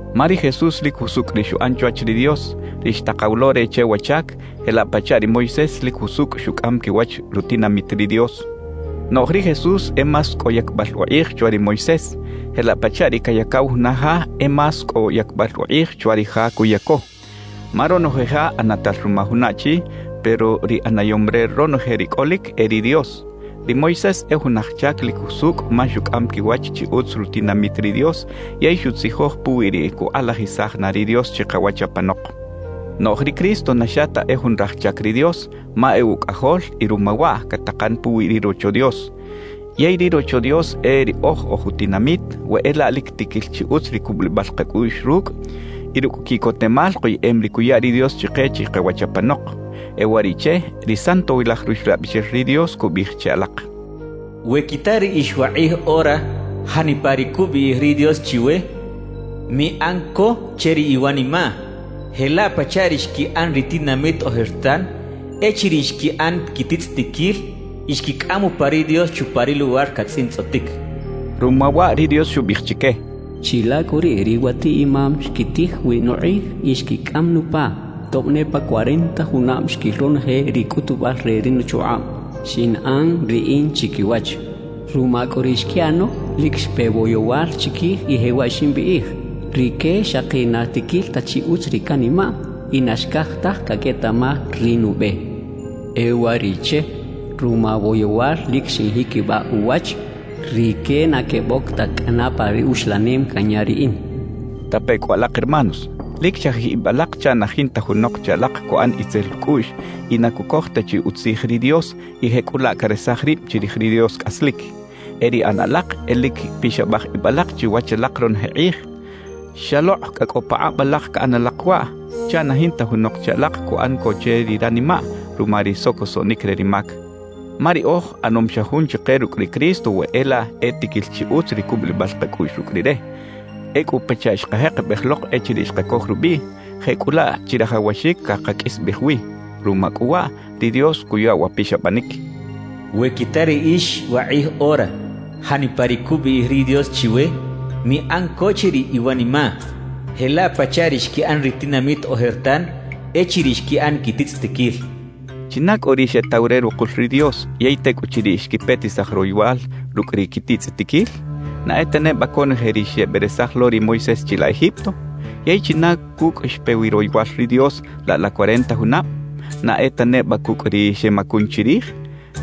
Ma ri Jesús lik jusukꞌ ri xuꞌan chwach ri Dios, ri xtaqaw lo re che wa chak, jelaꞌ pachaꞌ ri Moisés lik jusukꞌ xukꞌam kiwach rutinamit ri Dios. Noꞌj ri Jesús e más kꞌo yakbꞌal uqꞌij chwa ri Moisés, jelaꞌ pachaꞌ ri kayakaw juna ja e más kꞌo yakbꞌal uqꞌij chwa ri ja kuyako. Ma ronoje ja ꞌanatal ruma juna achi, pero ri ꞌanayom re ronoje ri kꞌolik e ri Dios. Ri Moisés e jun aj chak lik jusukꞌ ma xukꞌam kiwach chi utz rutinamit ri Dios yey xutzijoj puwi ri kuqꞌalajisaj na ri Dios chiqawach apanoq. Noꞌj ri Cristo na xa ta e jun raj chak ri Dios, ma e Ukꞌajol y ruma waꞌ kataqan puwi ri Rocho Dios. Yey ri Rocho Dios e riꞌoj oj utinamit, we e laꞌ lik tikil chi utz ri kubꞌulibꞌal qakꞌuꞌx rukꞌ y rukꞌ kiꞌkotemal qoyeꞌem ri kuya ri Dios chiqe chiqawach apanoq. E uwariꞌche, ri Santowilaj Ruxlabꞌixel ri Dios kubꞌiꞌij che alaq: We kita riꞌix waqꞌij ora janipa ri kubꞌiꞌij ri Dios chiwe, miꞌan ko che ri iwanimaꞌ jelaꞌ pachaꞌ ri xkiꞌan ri tinamit ojertan echiriꞌ xkiꞌan kititzꞌitikil y xkikꞌam upa ri Dios chupa ri luwar katzꞌintzꞌotik. Ruma waꞌ ri Dios xubꞌiꞌij chike: Chilaꞌ kꞌu riꞌ, riwatiꞌ-imam xkitij wi nuqꞌij y xkikꞌam nupa, tobꞌ ne pa cuarenta junabꞌ xkil ronoje ri kꞌutubꞌal re ri nuchuqꞌabꞌ xinꞌan Riꞌin chikiwach. Ruma kꞌu ri xkiꞌano, lik xpe woyowal chikij y jewaꞌ ximbꞌiꞌij: “Rike xaqi na tikil ta chi utz ri kanimaꞌ y na xkaj taj kaketaꞌmaj ri nubꞌe.” E uwariꞌche, ruma woyowal lik xinjikibꞌaꞌ uwach: “Rike na kebꞌok ta kꞌana pa ri uxlanem kanya Riꞌin.” Tape kꞌu alaq hermanos, lik chajij ibꞌ alaq chaꞌ na jinta junoq che alaq kuꞌan itzel ukꞌuꞌx y na kukoj ta chi utzij ri Dios y jekꞌulaꞌ karesaj ribꞌ chirij ri Dios kꞌaslik. E ri ꞌana alaq e lik pixabꞌaj ibꞌ alaq chiwach alaq ronoje qꞌij, xaloqꞌ kꞌa kꞌo paqꞌabꞌ alaq kaꞌan alaq waꞌ, chaꞌ na jinta junoq che alaq kuꞌan ko che ri ranimaꞌ ruma ri sokosoꞌnik re ri mak. Ma riꞌoj ꞌanom xa jun chiqe rukꞌ ri Cristo we e laꞌ e tikil chi utz ri kubꞌulibꞌal qakꞌuꞌx rukꞌ Rire; ekꞌu pachaꞌ xqajeqebꞌej loq echiriꞌ xqakoj rubꞌiꞌ, jekꞌulaꞌ chirajawaxik kaqakꞌisbꞌej wi. Ruma kꞌu waꞌ, ri Dios kuya wa pixabꞌanik: We kita riꞌix waqꞌij ora janipa ri kubꞌiꞌij ri Dios chiwe, miꞌan ko che ri iwanimaꞌ jelaꞌ pachaꞌ ri xkiꞌan ri tinamit ojertan echiriꞌ xkiꞌan kititzꞌitikil kachaꞌ. ¿China kꞌu ri xetaw re ruqul ri Dios yey tekꞌuchiriꞌ xkipetisaj royowal rukꞌ ri kititzꞌitikil? ¿Na e ta nebꞌa konoje ri xebꞌeresaj lo ri Moisés chilaꞌ Egipto? ¿Yey china kukꞌ xpe wi royowal ri Dios laꞌ la cuarenta junabꞌ? ¿Na e ta nebꞌa kukꞌ ri xemakun chirij?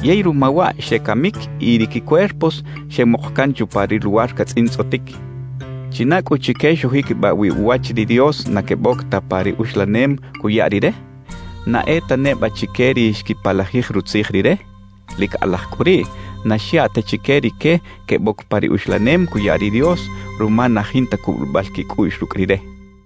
Yey ruma waꞌ xekamik y ri kicuerpos xemuq kan chupa ri luwar katzꞌintzꞌotik. ¿China kꞌu chike xujikibꞌaꞌ wi uwach ri Dios na kebꞌok ta pa ri uxlanem kuya Rire? ¿Na e ta nebꞌa chike ri xkipalajij Rutzij Rire? Lik qꞌalaj kꞌu riꞌ, na xyaꞌ ta chike rike kebꞌok pa ri uxlanem kuya ri Dios ruma na jinta kubꞌulibꞌal kikꞌuꞌx rukꞌ Rire.